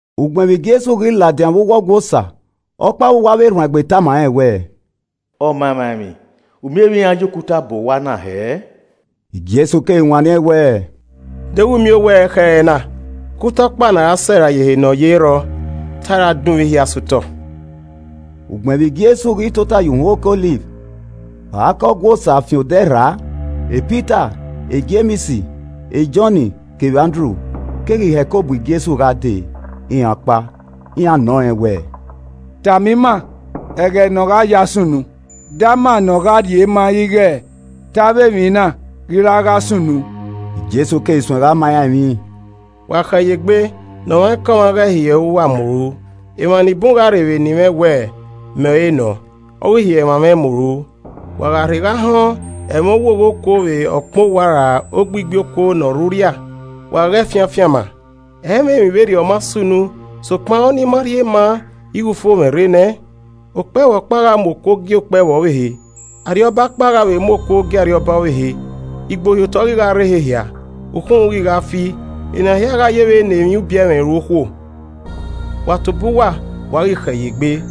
Ugbẹn vbe Jesu ghi ladian vbe uwu Ọgua Osa, ọkpa vbe uwu avbe erhuanegbe tama rẹn wẹẹ, “Ọmamwaemwi, u miẹn vbe iran ya okuta bọ owa na hẹẹ!” Jesu keghi wanniẹn wẹẹ, “Deghẹ u miẹn owa ẹrekhẹrẹ na? Okuta ọkpa ne a ra sẹ rae ye ehe nọ ye ẹ i rrọọ, ta a ra dunmwu ehia sẹ otọ.” Ugbẹn vbe Jesu ghi tota ye uhunmwu oke Ọliv, vbe a gha ke Ọgua Osa fian odẹ rra, Pita, Jems, Jọn, kevbe Andru keghi hẹko bu Jesu gha dee, iran ọkpa. Iran nọ rẹn wẹẹ, “Tama ima ẹghẹ ne ọ gha ya sunu. de ama ne ọ gha rhie ma ighe te avbe emwi na ghi ra gha sunu.” Jesu keghi suẹn gha ma iran emwi, “Wa khẹ ye egbe ne ọmwaikọmwa ghẹ hiẹ uwa mu ru. Emwa ni bun gha rre vbe eni mwẹ wẹ, ‘Mẹ ọre nọ,’ ọ ghi hiẹ emwa mwẹ mu ru. Wa gha rhe gha họn ẹmwẹ owogho okuo vbe ọkpẹn owa ra ogbigbi okuo ne ọ rre urria, wa ghẹ fian afianma. Ẹ i mwẹ emwi vberriọ ma sunu sokpan ọ nii ma rhie ma ighe ufomwẹ rre nẹ. Okpẹvbo ọkpa gha mu okuo gie okpẹvbo ọvbehe. Arriọba ọkpa gha vbe mu okuo gie arriọba ọvbehe. Igbohiotọ ghi gha rre ehe hia. Ukhunmwu ghi gha fi. Ena hia gha yevbe ne emwi ubiẹmwẹ ru okhuo. “Wa tobọ uwa, wa ghi khẹ ye egbe.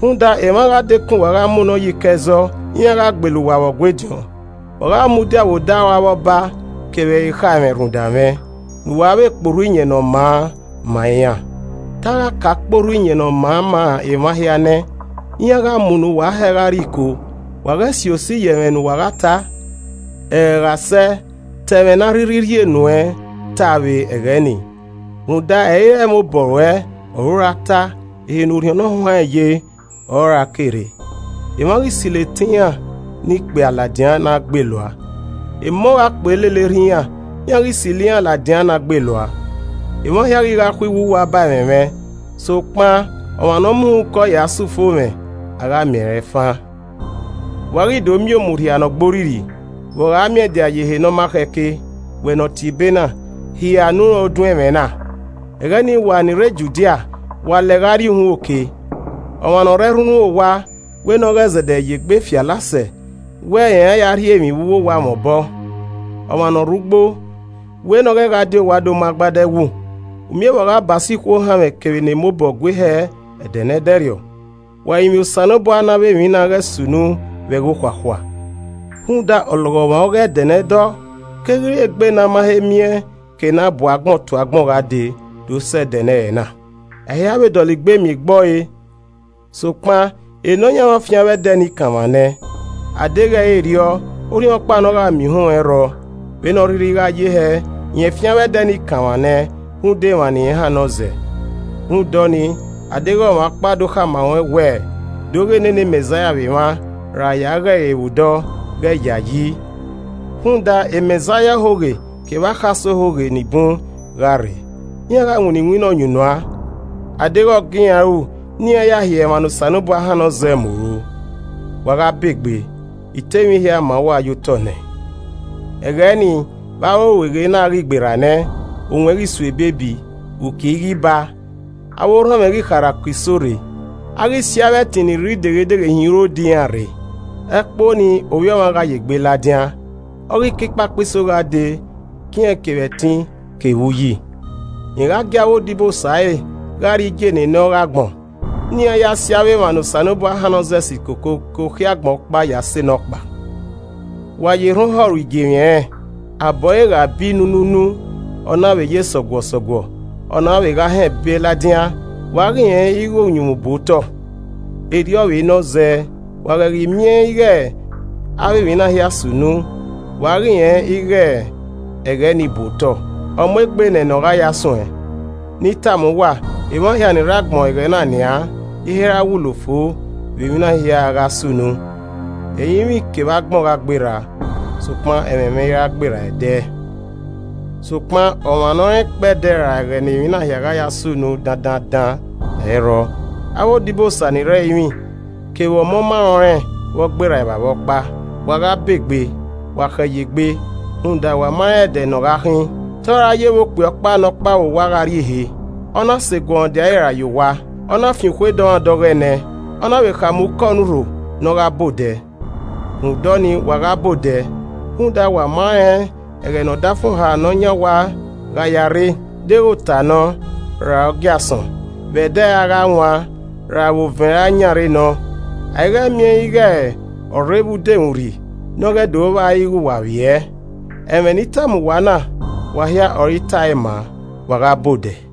Rhunmwuda emwa gha dekun uwa gha munọ ye iko ẹzọ. Iran gha gbele uwa vbe Ọgua ediọn. Wa gha mudia vbe odaro avbe ọba kevbe ekhaẹmwẹ rhunmwuda mwẹ, ne uwa kpe orhu Iyẹn Ne ọ maa ma iran. Te a gha ka kpe orhu iyẹn ne ọ maa ma emwa hia nẹ. Iran gha munọ uwa hẹ gha rrie iko, wa ghẹ si osi ye ẹmwẹ ne uwa gha ta. Ẹghẹ gha sẹ, ta ẹmwẹ ne a rhirhi rhie nuẹn ta vbe ẹghẹ nii. Rhunmwuda ẹ i re ẹmwẹ obọ ruẹ ọre u ra ta, ehe ne Orhiọn Nọhuanrẹn ye ọre ọ ra ke rre. Emwa ghi silo etẹn iran ne ikpia ladian ne agbelua, emọ gha kpe lele erha iran, iran ghi silo iran ladian ne agbelua. Emwa hia ghi gha khuiwu uwa ba ẹmwẹ mwẹ. Sokpan ọmwa ne ọ mu uhunmwu ke ọe ya sẹ ufomwẹ, a gha miẹn rẹn fan. “Wa ghi do miẹn ‘Omurhia Ne Ugborrirri’ vbe ọ gha miẹndia ye ehe ne ọ ma khẹ ke.” (Wẹ ne ọ tiebe na, hia ne u rẹn odun ẹmwẹ na.) “Ẹghẹ nii wa ni rre Judia, wa lẹ gha rrie uhunmwu oke. Ọmwa ne ọ rre ẹrhunrhun owa, wẹ ne ọ ghẹ zẹdẹ ye egbe fi alasẹ wẹ rẹn ra ya rhie emwi vbe uwu owa mwẹ obọ. Ọmwa ne ọ rre ugbo, wẹ ne ọ ghẹ gha di owa do mu agbada ẹwu. Umiẹn vbe ọ gha ba so ikhuo ohanmwẹ kevbe ne emobọ gue hẹ ẹdẹ ne ẹdẹrriọ. Wa rinmwian Osanobua ne avbe emwi na ghẹ sunu vbe ẹghẹ okhuakhua! Rhunmwuda ọlọghọmwa ọghe ẹdẹ ne ẹdọ keghi re egbe ne a ma he miẹn ke ne a bu agbọn tu agbọn gha dee do sẹ ẹdẹ ne ẹrẹna. A i ra vbe dọlegbe miẹn egbọre. Sokpan, e Nọyaẹnmwa fian avbe ẹdẹ nii kanmwa nẹ, adeghẹ ẹ i re erriọ, orhiọnkpa ne ọ gha miẹn uhunmwu ẹ i rrọọ, vbene ọ rhirhi a gha ye hẹẹ, rẹn fian avbe ẹdẹ ni kanmwa nẹ rhunmwuda emwa irẹn ne ọ hannọ zẹ. “Rhunmwuda ọnii, a deghẹ ọmwa ọkpa do khama ruẹn wẹẹ, ‘Do ghe nene Mẹzaia vbe emwa,’ ra ‘ya ghe ẹre vbe odọọ,’ ghe yayi. Rhunmwuda Mẹzaia ohoghe kevbe akhasẹ ohoghe ni bun gha rre. Iran gha winna iwinna ọyunnuan, a deghẹ ọ gie iran ru ne iran ya hiẹ emwa ne Osanobua hannọ zẹ mu ru. Wa gha ba egbe. I ta emwi hia ma uwa ye otọ nẹ. “Ẹghẹ nii, vbe avbe orueghe na a ghi gberra nẹ, owẹn ghi so ebiebi, uki i ghi baa. Avbe orhọnmwẹ ghi gha kharha ke iso rre, a ghi si avbe ẹtin ni rre ideghe-dieghe hin urodẹ iran rre. Ẹkpo nii Ovbi Ọmwa gha ye egbe ladian, ọ ghi ke ikpakpa iso gha dee ke irẹn kevbe ẹtin kevbe uyi. Rẹn gha gie avbe odibosa ẹre gha rrie igie enenẹ ọghe agbọn, ne iran si avbe emwa ne Osanobua hannọ zẹ si koko ke okhiẹ agbọn ọkpa ya sẹ nọkpa. “Wa ye erhan ohọ ru igiemwi ẹnrẹn. Abọ ẹre gha bi nunuunu, ọna vbe ye sọguọsọguọ, ọ na vbe gha họn ebe ladian, wa ghi rẹn ighẹ ẹghẹ uyunmwu bu otọ. Erriọ vbe nọ zẹẹ, wa ghẹ ghi miẹn ighẹ avbe emwi na hia sunu, wa ghi rẹn ighẹ ẹghẹ ni bu otọ, ọ mu egbe nẹ ne ọ gha ya suẹn. Ne I tama uwa, emwa hia ni ne agbọn ẹghẹ na nian i he ra wulo fo vbe emwi na hia a gha sunu. Ẹrinmwi kevbe agbọn gha gberra, sokpan ẹmwẹ mwẹ i ra gberra ẹdẹ. “Sokpan ọmwa ne ọ rẹn ikpẹdẹ ra ẹghẹ ne emwi na gha ya sunu dandaandan, ẹ i rrọọ, avbe odibosa ni rre ẹrinmwi, kevbe Ọmọ ma rẹn ọnrẹn vbe ọ gberra Evbavba ọkpa. Wa gha ba egbe, wa khẹ ye egbe, rhunmwuda wa ma rẹn ẹdẹ ne ọ gha khin. Te ọ ra ye vbe okpia ọkpa ne ọ kpao vbe owa gha rrie ehe, ọ na sẹ eguọmwadia ẹre rae ye owa, ọ na fian okhuo dọmwadẹ ọghọe nẹ ẹn, ọ na vbe khama ukọ ne urho ne ọ gha ba odẹ. Rhunmwuda ọnii, wa gha ba odẹ, rhunmwuda wa ma rẹn ẹghẹ ne ọdafẹn ne ọ yan owa gha ya rre, deghẹ ota nọ, ra ogiasọn, vbe ẹdẹ a gha wan, ra vbe ovẹn a yan rre nọ. A i ghẹ miẹn ighẹ ọ rre vbe udomwurri ne ọ ghẹ do vba ighẹ wa vbiẹ. Ẹmwẹ ne I tama uwa na, wa hia ọre I tae ma, wa gha ba odẹ!”